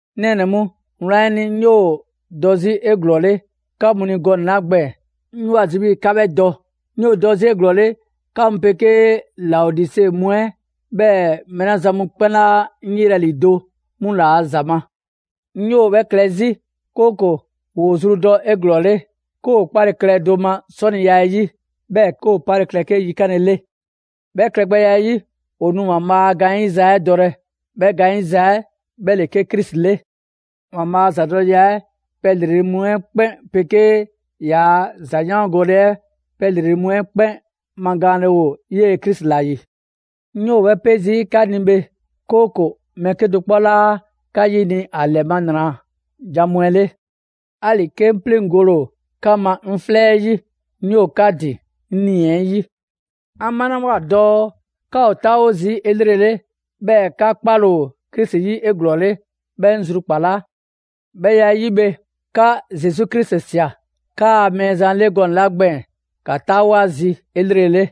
'Ŋ nɛɛnɛ‑ mu, wlan 'ɛ ni, 'ŋ 'yoo‑ dɔ 'zi 'eglɔɔle 'ka mu ni gɔnɛ‑ 'la gbɛɛn‑, 'ŋ 'yoo‑ ‑a zi 'bhii‑ 'ka 'bhɛ dɔ. 'Ŋ 'yoo‑ dɔ 'zi 'eglɔɔle 'ka mu 'pegee Laodise mu 'ɛ, 'bhɛɛ‑ mɛɛ 'la zan mu 'kpɛn 'laa 'ŋ 'yelɛ‑ ‑lido' 'mu ‑laa' ‑za ma. 'Ŋ 'yoo‑ 'bhɛ klɛ 'zi, 'kooko‑ ‑woo zru dɔ 'eglɔɔle, 'ke ‑o 'kpale‑ klɛ do ma 'sɔniya 'ɛ 'yi; 'bhɛɛ‑ 'ke ‑o 'pale‑ klɛ 'ke 'yikanle 'le. 'Bhɛ klɛgbɛya 'ɛ 'yi, ‑o nu ‑Waanbhaa' a gaanyiza 'ɛ dɔlɛ, 'bhɛ gaanyiza 'ɛ 'bhɛ ‑le 'ke Krisi 'le. ‑Waanbhaa' a ‑zadɔleya 'ɛ 'yi pɛ ‑lrele' mu 'ɛ 'kpɛn 'pegee ‑yaa' ‑zayaangole 'ɛ 'yi pɛ ‑lrele' mu 'ɛ 'kpɛn magaanle ‑o 'yee‑ Krisi ‑la ‑yi. 'Ŋ 'yoo‑ 'bhɛ 'pe zii' 'ka ni bhe, 'kooko‑ mɛɛ 'kedo‑ 'kpɔ 'laa 'ka 'yini‑ ‑a ‑lɛ ma ‑nra jan mu 'ɛ 'le. ‑Ali‑ 'ke 'ŋ 'pleŋgole ‑o 'ka ma 'ŋ 'flɛ 'ɛ 'yi, 'ŋ 'yoo‑ 'ka ‑din 'ŋ 'nii‑ 'ɛ 'yi. 'An 'malawoa dɔɔ 'ka ‑o 'taawo zii' 'elrele, 'bhɛɛ‑ 'ka 'kpale‑ ‑o Krisi 'yi 'eglɔɔle, 'bhɛ 'ŋ zrukpalaa. 'Bhɛ ‑ya 'ɛ 'yi bhe, 'ka Zesu Krisi ꞊sia 'kaa Mɛɛzan 'le gɔnɛ‑ 'la gbɛɛn‑, ‑ka 'taawo ‑a zi 'elrele.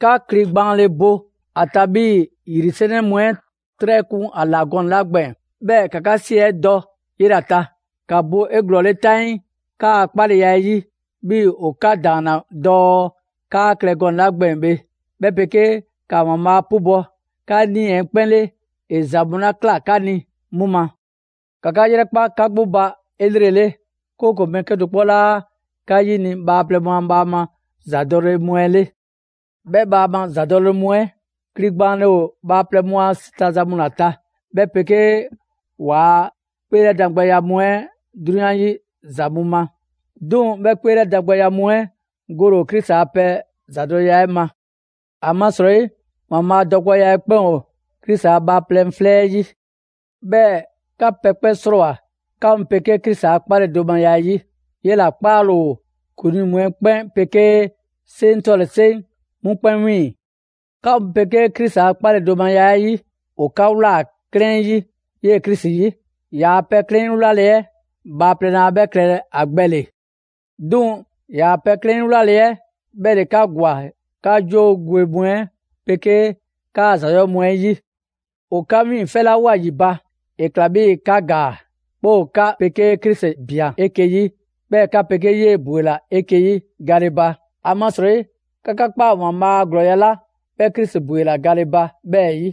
'Ka kli gbaanle bo ‑a ta 'bhii‑ ‑yri 'sɛnɛ mu 'ɛ 'trɛ kun ‑a ‑la gɔnɛ‑ 'la gbɛɛn‑, 'bhɛɛ‑ ‑ka 'ka 'si 'ɛ dɔ 'yela‑ ta. ‑Ka bo 'eglɔɔle 'taŋii 'kaa‑ 'kpaleya 'ɛ 'yi, 'bhii‑ ‑o 'ka ‑daanna dɔɔ 'kaa klɛ gɔnɛ‑ 'la gbɛɛn‑ bhe; 'bhɛ 'pegee ‑ka ‑Waanbhaa' 'pubɔ‑ 'ka nii‑ 'ɛ 'kpɛn 'le ‑e ‑za mu 'la ꞊kla 'ka ni 'mu ma. ‑Ka 'ka 'yrɛkpa 'ka 'gbu ba 'elrele, 'kooko‑ mɛɛ 'kedo‑ 'kpɔ 'laa 'ka 'yini bhaaplɛŋ mu a bhaama ‑zadɔle mu 'ɛ 'le; 'bhɛ bhaama ‑zadɔle mu 'ɛ kli gbaanle ‑o bhaaplɛŋ mu a 'si ta za mu ‑la ta, 'bhɛ 'pegee ‑waa' 'kpeelɛdangbɛya mu 'ɛ 'drunyan 'yi ‑za mu ma. 'Duŋ‑ 'bhɛ 'kpeelɛdangbɛya mu 'ɛ gole ‑o Krisi a pɛ ‑zadɔleya 'ɛ ma. ‑Amasrɔyi, ‑Waanbhaa' dɔgbɛya 'ɛ 'kpɛn ‑o Krisi a bhaaplɛŋ 'flɛ 'ɛ 'yi. 'Bhɛɛ‑ 'ka pɛ 'kpɛn 'srɔɔwoa‑ 'ka mu 'pegee Krisi a 'kpaledomaya 'ɛ 'yi. 'Yela‑ 'kpaale ‑o ‑kuŋlii mu 'ɛ 'kpɛn 'pegee 'seŋ 'tɔle‑ 'seŋ 'mu 'kpɛn 'wiiŋ‑. 'Ka mu 'pegee Krisi a 'kpaledomaya 'ɛ 'yi, ‑o 'ka ꞊wlaa 'klɛɛn 'yi 'yee‑ Krisi 'yi. Yaa pɛ 'klɛɛn 'ɛ 'yi wlale 'ɛ bhaaplɛŋ laa 'bhɛ klɛlɛ ‑a gbɛ ‑le. 'Duŋ‑ ‑yaa' pɛ 'klɛɛn 'yi 'wlale‑ 'ɛ 'bhɛ ‑le 'ka ‑gwa 'ka 'joo gwe mu 'ɛ 'pegee 'kaa‑ ‑za 'yɔɔ‑ mu 'ɛ 'yi. ‑O 'ka 'wiiŋfɛlawoa ‑yi ba, ‑e ꞊kla 'bhii‑ 'ka ‑gaa, 'bhɛɛ‑ ‑o 'ka 'pegee Krisi ꞊bian 'eke‑ 'yi; 'bhɛɛ‑ 'ka 'pegee 'yee‑ ‑bwela 'eke‑ 'yi gale ba. ‑Amasrɔyi 'ka 'ka ꞊kpaa ‑Waanbhaa' a ‑glɔɔya' 'la 'bhɛ Krisi ‑bwela ba 'bhɛɛ‑ 'yi.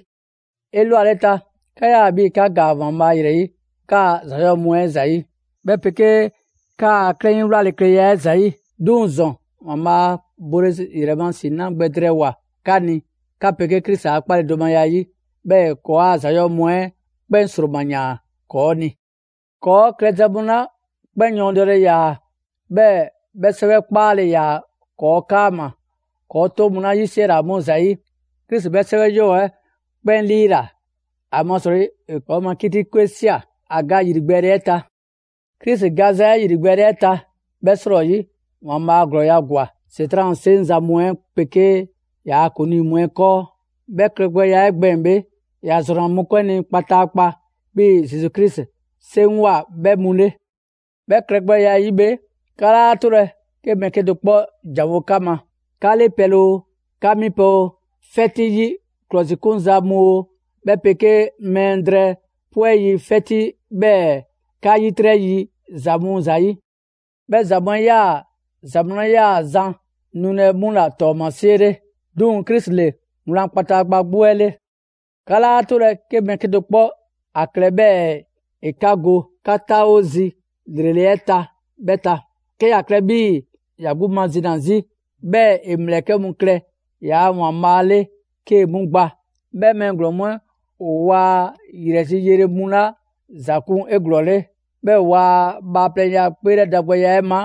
'Elwaleta, 'ka 'yaa‑ 'bhii‑ 'ka ‑gaa ‑Waanbhaa' ‑yrɛ 'yi 'kaa‑ ‑za 'yɔɔ‑ mu 'ɛ ‑zayi', 'bhɛ 'pegee 'kaa‑ 'klɛɛn 'yi wlalekleya 'ɛ ‑zayi'. 'Duŋ‑ ‑zɔn, ‑Waanbhaa' bole ‑yrɛ ma ‑si 'na gbɛ drɛɛwoa‑ 'ka ni 'ka 'pegee Krisi a 'kpaledomaya 'ɛ 'yi, 'bhɛɛ‑ ‑e ‑kɔɔa' ‑za 'yɔɔ‑ mu 'ɛ 'kpɛn ‑sroma ‑yaan ‑kɔɔ' ni. ‑Kɔɔ' klɛza ‑yɔɔ' mu 'la 'kpɛn yɔɔndɛle ‑yaa, 'bhɛɛ‑ 'bhɛ 'sɛwɛ 'kpaale ‑yaa ‑kɔɔ' 'kaama‑ ‑kɔɔ' 'toŋ mu 'la 'yisiɛla 'mu ‑zayi'; Krisi 'bhɛ 'sɛwɛ 'yɔɔ‑ 'ɛ 'kpɛn 'liila‑; ‑amasrɔyi ‑e ‑kɔɔ' ma 'kiti 'kwe ꞊sia a ga ‑yrigbɛɛle 'ɛ ta. Krisi gaza 'ɛ ‑yrigbɛɛle 'ɛ ta, 'bhɛ 'srɔyi, ‑Waanbhaa' ‑glɔɔya' ‑gwa ‑Setran' a 'seŋzan‑ mu 'ɛ 'pegee ‑yaa' ‑kuŋlii mu 'ɛ 'kɔɔ. 'Bhɛ klɛgbɛya 'ɛ gbɛɛn‑ bhe, ‑ya ‑zrɔnna mɔkpɛn' ni kpataakpa 'bhii‑ Zesu Krisi 'seŋgwa꞊ 'bhɛ mu 'le. 'Bhɛ klɛgbɛya 'ɛ 'yi bhe, 'ka 'laa 'tolɛ‑ 'ke mɛɛ 'kedo‑ 'kpɔ ‑janwo' 'ka ma: 'ka 'le pɛle oo, 'ka mi pɛ oo, 'fɛti yi ‑klɔsikunza mu oo, 'bhɛ 'pegee mlɛ drɛɛ 'pwɛ yi 'fɛti 'bhɛɛ‑ 'ka 'yitrɛ yi ‑za mu ‑zayi'. 'Bhɛ ‑za mu 'ɛ 'yaa‑ ‑za mu 'la 'yaa‑ zan nulɛ 'mu ‑la ‑tɔɔmasie 'le; 'duŋ‑ Krisi ‑le wlan kpataakpa 'gbu 'ɛ 'le. 'Ka 'laa 'tolɛ‑ 'ke mɛɛ 'kedo‑ 'kpɔ 'a klɛ 'bhɛɛ‑ ‑e 'ka go 'ka 'taawo zi ‑lrele' 'ɛ ta 'bhɛ ta, 'ke ‑ya klɛ 'bhii‑ ‑ya 'gbu mazina 'zi, 'bhɛɛ‑ ‑e ‑mlɛkɛ' mu klɛ ‑yaa' ‑waanbhaa' 'le 'kee‑ 'mu gba. 'Bhɛ mɛɛ ‑glɔɔn mu 'ɛ, ‑o waa ‑yrɛ zi yele mu ‑la ‑za kun 'eglɔɔle; 'bhɛɛ‑ ‑waa' bhaaplɛŋya 'kpeelɛdangbɛya 'ɛ ma,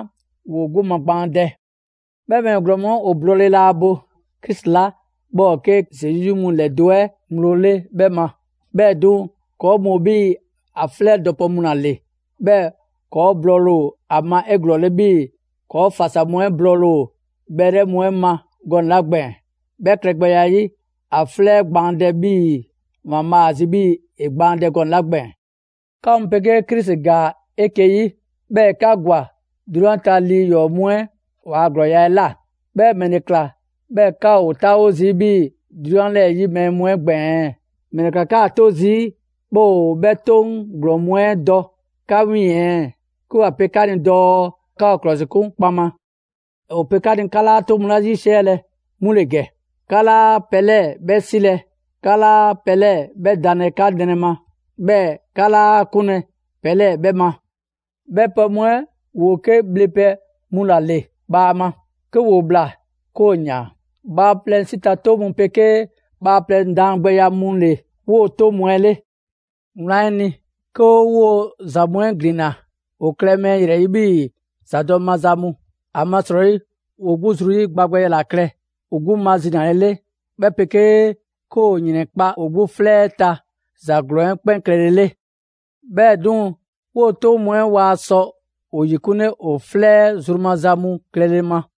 ‑woo 'gbu magbaandɛ. 'Bhɛ mɛɛ ‑glɔɔn mu 'ɛ ‑o blɔɔle laa bo Krisi 'la 'bhɛ ‑o 'ke Zesu 'yi mu ‑lɛdo' 'ɛ ŋgblo 'le 'bhɛ ma. 'Bhɛɛ‑ 'duŋ‑, ‑kɔɔ' mu ‑o 'bhii‑ ‑a 'flɛ dɔpɛ mu ‑la ‑le, 'bhɛɛ‑ ‑kɔɔ' blɔɔle ‑o ‑a ma 'eglɔɔle 'bhii‑ ‑kɔɔ' ‑fasa mu 'ɛ blɔɔle ‑o bhɛlɛ' mu 'ɛ ma gɔnɛ‑ 'la gbɛɛn‑. 'Bhɛɛ‑ klɛgbɛya 'ɛ 'yi, ‑a 'flɛ gbaandɛ 'bhii‑ ‑Waanbhaa' ‑a zi 'bhii‑ ‑e gbaandɛ gɔnɛ‑ 'la gbɛɛn‑. 'Ka mu 'pegee Krisi ‑gaa 'eke‑ 'yi, 'bhɛɛ‑ ‑e 'ka ‑gwa 'drunyan ta lii ‑yɔɔ' mu 'ɛ waa ‑glɔɔya' 'ɛ ꞊la. 'Bhɛɛ‑ ‑mɛle ꞊kla 'bhɛɛ‑ 'ka ‑o 'taawo zii' 'bhii‑ 'drunyan 'lɛɛ‑ 'yi mɛɛ mu 'ɛ gbɛɛn‑ ɛɛ? ‑Mɛle ꞊kla 'kaa‑ 'to zii' 'bhɛɛ‑ ‑o 'bhɛ 'toŋ ‑glɔɔn mu 'ɛ dɔ 'ka 'wiiŋ‑ ɛɛ, 'ke ‑wa pe 'ka ni dɔɔ 'ka ‑o ‑klɔsikun kpaŋma? ‑O pe 'ka ni 'ka 'laa 'toŋ mu 'la 'yisiɛlɛ 'mu ‑le ‑gɛ: «'Ka 'laa pɛ 'lɛɛ‑ 'bhɛ 'silɛ‑. 'Ka 'laa pɛ 'lɛɛ‑ 'bhɛ danlɛ 'ka nrɛ ma». 'Bhɛɛ‑ «'ka 'laa 'kunlɛ‑ pɛ 'lɛɛ‑ 'bhɛ ma.» 'Bhɛ pɛ mu 'ɛ ‑woo 'ke bhle pɛ mu ‑la ‑le bhaama. 'Ke ‑woo ꞊bhla, 'ke ‑o ‑yaan. Bhaaplɛŋ 'si ta 'toŋ mu 'pegee bhaaplɛŋ daangbɛya mu ‑le 'woo‑ 'toŋ mu 'ɛ ‑le. Wlan 'ɛ ni, 'ke 'o 'woo‑ ‑za mu 'ɛ ‑glinna, ‑o klɛ mɛɛ ‑yrɛ 'yi 'bhii ‑zadɔ' maza mu. ‑Amasrɔyi ‑woo 'gbu zru 'yi gba gbɛya ‑la klɛ, ‑o 'gbu mazinalele, 'bhɛ 'pegee 'ke ‑o ‑yrɛnkpa' ‑o 'gbu 'flɛ 'ɛ ta ‑za ‑glɔɔn 'ɛ 'kpɛn klɛlele. 'Bhɛɛ‑ 'duŋ‑, 'woo‑ 'toŋ mu 'ɛ waa sɔ ‑o ‑yikunle ‑o 'flɛ 'ɛ zru maza mu klɛle ma.